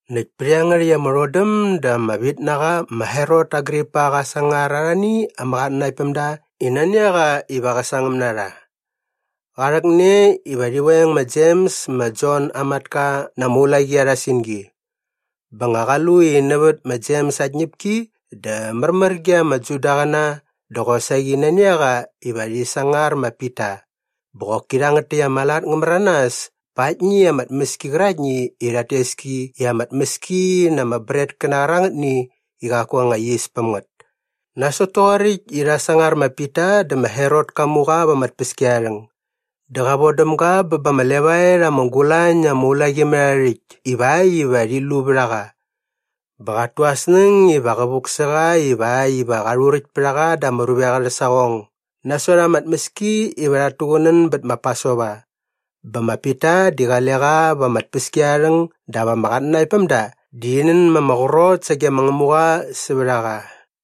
Näkt pät iangärhäkt ama rhodäm dä ama vitnaqa ma Herot Agripa qa sangar arhani ama qatnanaktpämda i nani a qa iva qä sangäm na rha. Qa rhäkne iva rhi veng ma Jems ma Jon aa matka na ama ulaqi arha singi. Bä nga qa lu i nävät ma Jems aa tñäpki dä märmär ge ama Judaqäna dä qosaqi nani a qa iva rhi sangar ma Pita. Bä qoki rhangät täkt ama lat ngä märanas pa aktni ama tmäski qäraktni i rhat tes ki i ama tmäski na ama bretkäna qärangätni i qaku anga yis päm ngät. Nasot toqoräkt i rha sangar ma Pita dä ma Herot ka mu qa va ama tpäskiarharhäng. Dä qa von däm ga bä ba ama levaet ama gulañ na ama ulaqimärharhärhäkt ivakt iva rhit lu vät a qa. Bä qat tu aa snäng iva qä vuk sä qa ivakt iva qa rhuräkt pät a qa da ama ruvek arhä saqong nasot ama tmäski iva rhat tuqunän bät ma Pasova. Bä ma Pita di qale qa va ama tpäskiarharhäng dap ama qatnanaktpämda di rhi nän ma ama qrot sage ma Ngämuqa sävät a qa.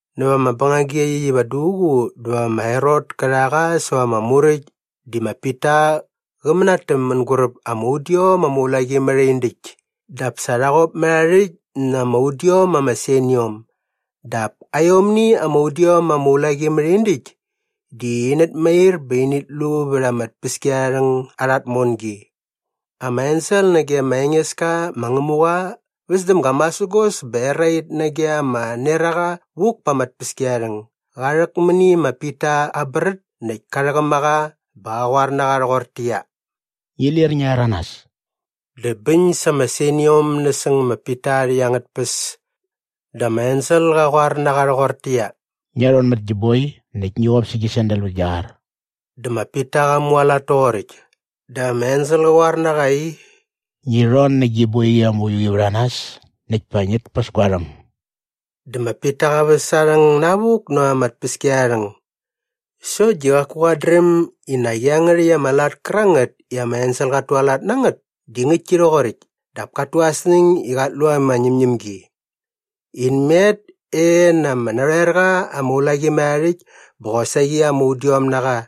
Näva ama bängagi iaqyäkt iva duququ dä va ma Herot kä rha qa säva ama muräkt di ma Pita qä mänatäm mänguräp ama udiom ama ulaqimärhindäkt dap sa rha qop mät aa rhäkt na ama udiom ama seniom. Dap aiomni ama udiom ama ulaqimärhindäkt di inät mair bä init lu vät ama tpäskiarharhäng arha tmongi. Ama ensel nage ma Engeska ma Ngämuqa väs däm ga masägos bä erait nage ama neraqa vuk pa ama tpäskiarharhäng. Qa rhäk mäni ma Pita aa brät näkt ka rhäqäm a qa bä qa qoar na qa rhoqortäqyia, “Ngi lir ngia rhäranas.” Dä bäñ sa ama seniom nasäng ma Pita aa rhäkt angät tpäs. Dä ama ensel qa qoar na qa rhoqortäqyia, “Ngia rhon mät gi boi näkt ngi qop sä gi sandal vät gia qar.” Dä ma Pita qa mualat toqoräkt. Dä ama ensel qä qoar na qa i, “Ngi rhon nä gi boiqi ama uiu qi vät a nas näkt pa ngit päs gua rhäng.” Dä ma Pita qa väs aa rhäng navuk näva ama tpäskiarharhäng. Sokt di qaku qat dräm i nak iangärhäkt ama lat kärangät i ama ensel qat tualat na ngät di ngäktki rhoqoräkt dap kat tu aa snäng i qat lu ama ñämñämgi. In met e na ama narhoerqa ama ulaqimärhaarhäkt bä qosaqi ama udiom na qa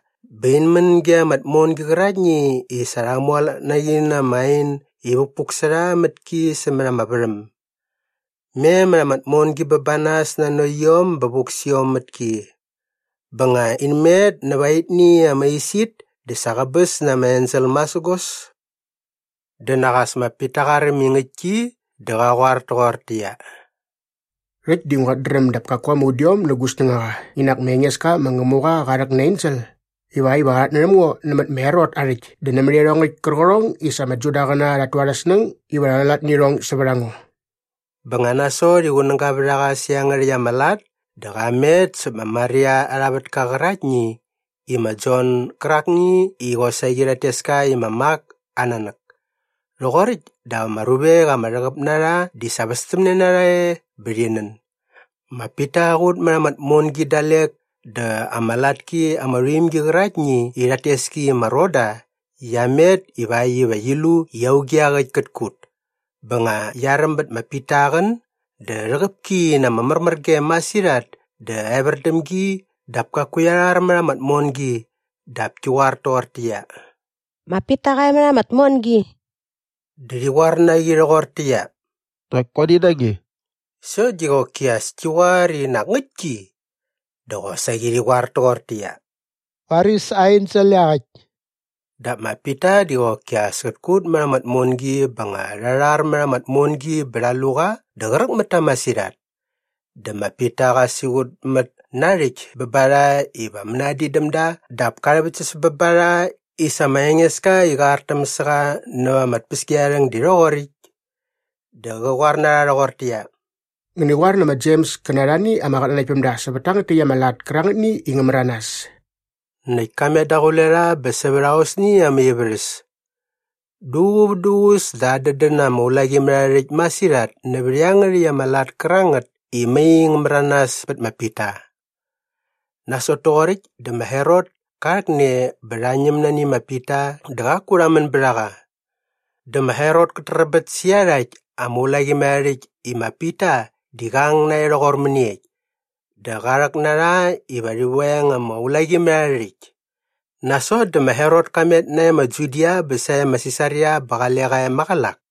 bä in män ge ama tmongi qäraktni i sa rha mualat na qi na ama ain i vukpuk sä rha mät ki sämät ama värhäm. Me mät ama tmongi bä ba nas nanokt iom bä vuk sä iom mät ki. Bä nga in met näva aitni ama isit dä sa qäbäs na ama ensel masägos. Dä nak as ma Pita qa räm i ngäktki dä qa qoar toqortäqyia, “Rhäkt di nguat dräm dap kaku ama udiom nä gu snängaqa i nak ma Engeska ma Ngämuqa qa rhäk na aa ensel ivakt iva qa rhatnärhäm ngo nämät ma Herot aa rhäkt dä nämät iarhongäkt kärqärhong i sa ama Judaqäna rhat tu arhä snäng iva rha rhualat nä irhong sävät a ngo.” Bä nga nasot i qunäga vät a qa sä rhangät täkt ama lat dä qa met säp ma Maria arha vätka qäraktni i ma Jon gärakni i qosaqi rhat tes ka i ma Mak aa nanäk. Rhoqoräkt dap ama ruvek ama rhäqäp na rha di sa västämne na rha e bä rhi nän. Ma Pita qa qut mät ama tmongi dalek dä ama latki ama rhuimgi qäraktni i rhat tes ki i ma Roda qia met ivakt iva qi lu i auge iaqäkt kät kut. Bä nga qia räm bät ma Pita aa qän dä rhäqäp ki na ama märmärgem masirhat dä evär däm gi dap kaku qia rhar mät ama tmongi dap ki qoar toqortäqyia, “Ma Pita qa e mät ama tmongi.” Dä rhi qoar na qi rhoqortäqyia, “Nak guani na nge.” Sokt di qoki as ki qoar i nak ngäktki. Dä qosaqi rhi qoar toqortäqyia, “Varis aa ensel iaqäkt.” Dap ma Pita di qoki as kät kut mät ama tmongi bä nga rha rhar mät ama tmongi bä rha lu qa dä qräk mät ta masirhat. Dä ma Pita qa siqutmät na aa rhäkt bä ba rha iva mänadin däm da dap ka rhäväktsäs bä ba rha i sa ma Engeska i qa artäm sa qa näva ama tpäskiarharhäng di rhoqoräkt. Dä qä qoar na rha rhoqortäqyia, “Ngäni qoar nä ma Jems kä na arhani ama qatnanaktpämda sävät tangät täkt ama lat kärangätni i ngä märanas.” Näkt ka met daqule rha bä sävät aosni ama ivärhäs. Duququ vät duququs dä adädän ama ulaqimärharhärhäkt masirhat nävät iangärhäkt ama lat kärangät i mai ngä märanas pät ma Pita. Nasot toqoräkt dä ma Herot ka rhäkne bä rha ñäm nani ma Pita dä qaku rha män bät a qa. Dä ma Herot kät träbät sä iarhakt ama ulaqimärharhärhäkt i ma Pita di qa ang nae rhoqor mäniekt? Dä qa rhäk na rha iva rhi veng ama ulaqimärharhärhäkt. Nasot dä ma Herot ka met nae ma Judia bä sae ma Sisaria bä qale qa e maqälak.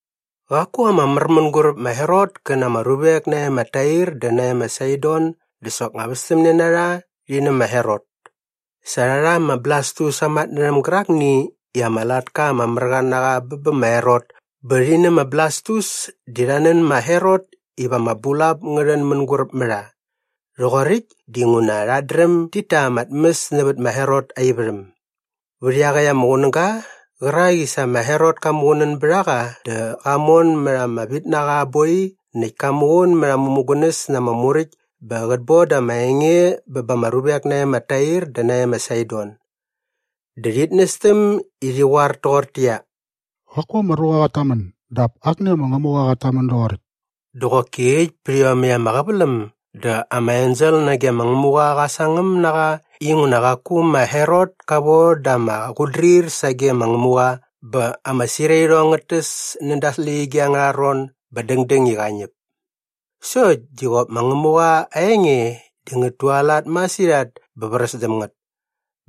Qaku ama mär mänguräp ma Herot kä na ama ruvek nae ma Tair dä nae ma Saidon dä soknga västämne na rha rhi nä ma Herot. Sa rha rha ma Blastus aa matnärhäm gärakni i ama latka ama mär qa na qa bä bä ma Herot bä rhi nä ma Blastus di rha nän ma Herot iva ama bulap ngä rhän mänguräp mä rha. Rhoqoräkt dinguna rhat dräm dit ta ama tmäs nävät ma Herot aa ivärhäm. Vät iaqäkt ama qunäga qärak i sa ma Herot ka muqunän bät a qa dä qa mon mät ama vitnaqa aa boi näkt ka muqun mät aa mämugunäs na ama muräkt bä qät boda ama enge bä ba ama ruvek nae ma Tair dä nae ma Saidon. Dä rhit nästäm i rhi qoar toqortäqyia, “Qaku ama ruqa qat tamän dap akni ama ngämuqa qat tamän doqoräkt.” Dä qoki äkt pät iomäkt ama qäväläm dä ama ensel nage ma ma Ngämuqa qa sangäm na qa inguna qaku ma Herot ka von da ama qutdrir sage ma Ngämuqa bä ama sirairhong ngät täs näda aa släqyige angärha ron bä dängdäng i qa ñäp. Sokt di qop ma Ngämuqa aa enge di ngät tualat masirhat bä vräs däm ngät.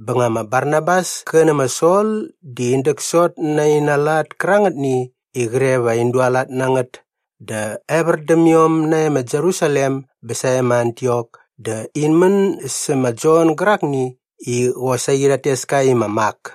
Bä nga ma Barnabas kä nä ma Sol di in däksot na aina lat kärangätni i qre va in dualat na ngät dä evär däm iom nae ma Jerusalem bä sae ma Antiok dä in män sä ma Jon gärakni i qosaqi rhat tes ka i ma Mak.